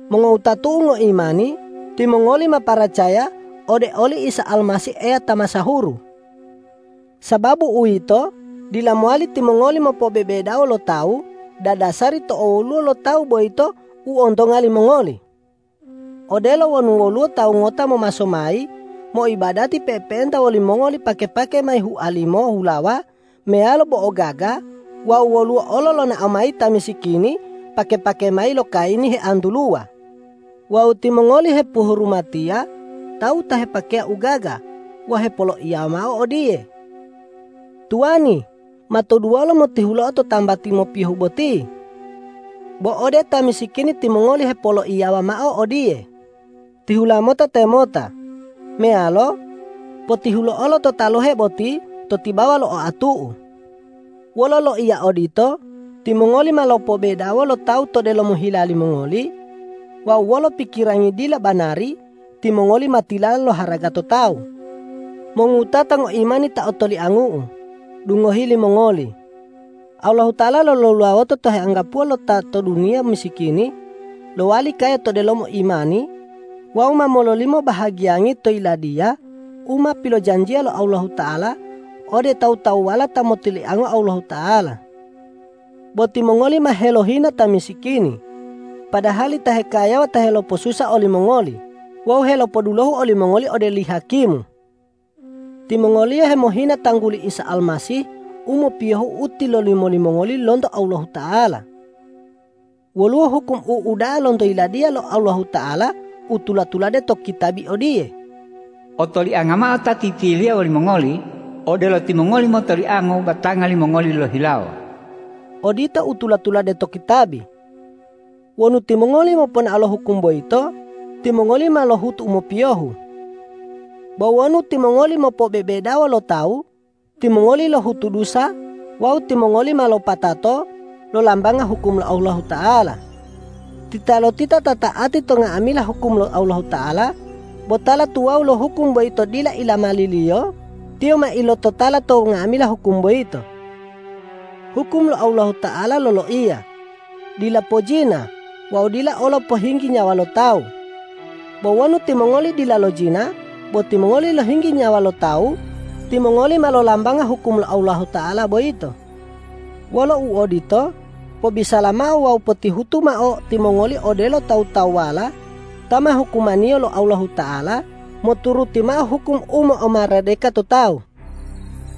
Mongowutatu'u ngoimani, timongoli ma paracaya ode oli Isa Almasih Eya ta masahuru. Sababu uwito, dila mowali timongoli mopobebedawo lo tawu dadasari to owoluwo lo tawu boyito u ontonga limongoli. Odelo wonu woluwo tawu ngota momaso mayi moibadati pe'epe'enta wolimongoli pake-pake mayi hualimo hulawa meyalo bo'o gaga wawu woluwo olo lonao mayi ta misikini pake-pake mayi lo kayini hea'antuluwa. Wawu timongoli hepohurumatiya tawu ta hepakeya u gaga wawu hepoloiyawa mao odiye,”Tuwani, ma toduwola motihuloa to tambati mopiyohe boti.” Bo ode ta misikini timongoli hepoloiyawa mao odiye,”Tihula mota temota!” meyalo”Potihulo'olo to talohe boti to tibawa lo oatu'u.” Wolo loiya odito timongoli ma lopobedawo lo tawu to delomo hila limongoli wawu wolo pikirangi dila banari, timongoli ma tilala loharaga to tawu. Mongowutata ngoimani ta otoliangu'u, dungohi limongoli: Allahuta'ala lolulawota ta heanggapuwo lo ta to duniya misikini lowali kaya to delomo imani wawu ma mololimo bahagiyangi to Yiladiya u ma pilojanjiya lo Allahuta'ala ode tawu-tawuwala ta motoliango Allahuta'ala. Bo timongoli ma helohina ta misikini, padahali ta hekayawa ta helopo'osusa olimongoli wawu helopodulohu olimongoli ode oli hakimu. Timongoliyo hemohina tangguli Isa Almasih u mopiyohu u tilolimo limongoli lonto Allahuta'ala. Woluwo hukum u uda'a lonto Yiladiya lo Allahuta'ala u tula-tulade to kitabi odiye,”Otolianga mao ta titiliya woli mongoli odelo timongoli motoliango batanga limongoli lohihilawo.” Odito u tula-tulade to kitabi. Wonu timongoli moponao lo hukum boyito, timongoli ma lohutu u mopiyohu. Bo wonu timongoli mopobebedawo lo tawu, timongoli lohutu dusa wawu timongoli ma lopatato lolambanga hukum lo Allahuta'ala. Titalotita ta ta'ati to nga'amila hukum lo Allahuta'ala bo tala tuwawu lo hukum boyito dila ilamaliliyo, tiyo ma ilototala to nga'amila hukum boyito. Hukum lo Allahuta'ala loloiya, dila pojina wawu dila olo pohinggi nyawa lo tawu. Bo wonu timongoli dila lojina bo timongoli lohinggi nyawa lo tawu, timongoli ma lolambanga hukum lo Allahuta'ala boyito. Wolo uodito, pobisala mao wawu potihutu mao timongoli odelo tawu-tawuwala ta ma hukumaniyo lo Allahuta'ala moturuti mao hukum u mo'omaradeka to tawu.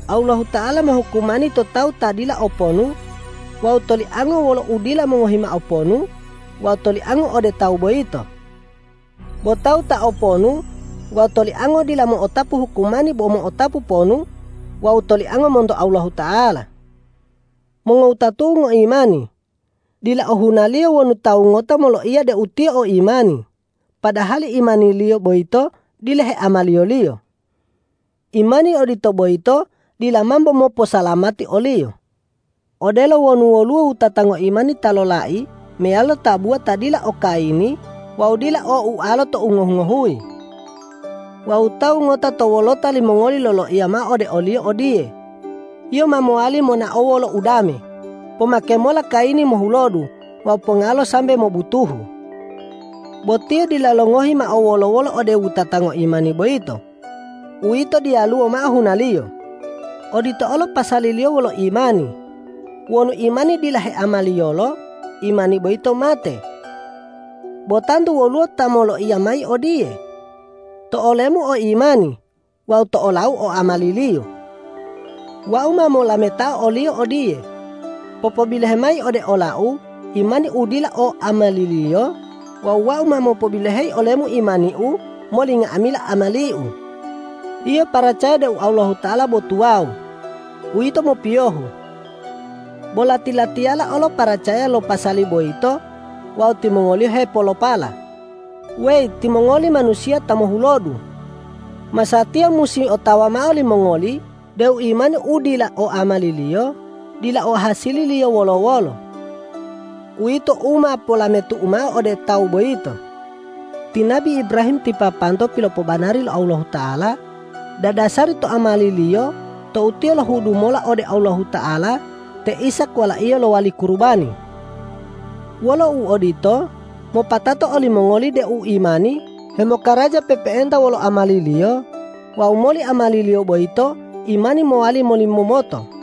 Allahuta'ala mohukumani to tawu ta dila o ponu wawu toliango wolo udila mongohi mao ponu wawu toliango ode tawu boyito. Bo tawu ta o ponu wawu toliango dila mo'otapu hukumani bo mo'otapu ponu wawu toliango monto Allahuta'ala. Mongowutatu'u ngoimani, dila ohunaliyo wonu tawu ngota moloiya deu tiyo o imani, padahali imaniliyo boyito dila heamaliyoliyo. Imani odito boyito dila mambo moposalamati oliyo. Odelo wonu woluwo wutata ngoimani ta lolai meyalo tabuwa ta dila o kayini wawu dila o ualolo tou ngohuyi-ngohuyi. Wawu tawu ngota to wolota limongoli loloiya mao ode oliyo odiye,”Yio ma mowali monao wolo udame; pomake mola kayini mohulodu wawu pongalo sambe mobutuhu!” Bo tiyo dila longohi mao wolo-wolo ode wutata ngoimani boyito; uwito diyaluwo mao hunaliyo. Odito olo pasaliliyo wolo imani: Wonu imani dila heamaliyolo, imani boyito mate. Bo tantu woluwo ta moloiya mayi odiye,”To olemu o imani wawu to olau o amaliliyo.” Wau ma molametao oliyo odiye,”Popobilohe mayi ode olau imanimu u dila o amaliliyo wawu wau ma mopobiloheyi olemu imaniu moli nga'amila amaliu.” Yio paracaya deu Allahuta'ala bo tuwawu. Uwito mopiyohu. Bo lati-latiyala olo paracaya lo pasali boyito wawu timongoliyo hepolopala. Weyi timongoli manusiya ta mohulodu! Masatiya musi otawa mao limongoli deu imani u dila o amaliliyo dila o hasililiyo wolo-wolo. Uwito u ma polametu'u mao ode tawu boyito. Ti nabi Ibrahim ti papanto pilopobanari lo Allahuta'ala dadasari to amaliliyo tou tiyo lohudu mola ode Allahuta'ala te Ishak walaiyo lowali kurubani. Wolo uodito, mopatato olimongoli deu imani hemokaraja pe'epe'enta wolo amaliliyo wawu moli amaliliyo boyito imani mowali molimomoto.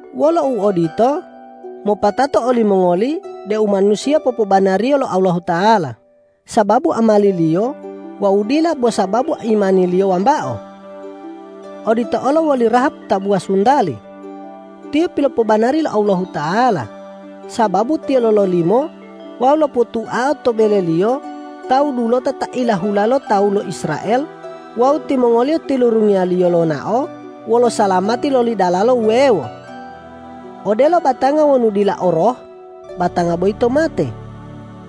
Wolo uodito, mopatato olimongoli deu manusiya popobanariyo lo Allahuta'ala sababu amaliliyo wawu dila bo sababu imaniliyo wambao. Odito olo woli Rahab tabuwa suntali. Tiyo pilopobanari lo Allahuta'ala, sababu tiyo lololimo wawu lopotuao to beleliyo tawu dulota ta ilahula lo tawu lo Israel wawu timongoliyo tilurungiyaliyo lonao wolo salamati loli dalala wuwewo. Odelo batanga wonu dila o roh, batanga boyito mate;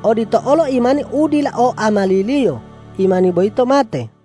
odito olo imani u dila o amaliliyo, imani boyito mate.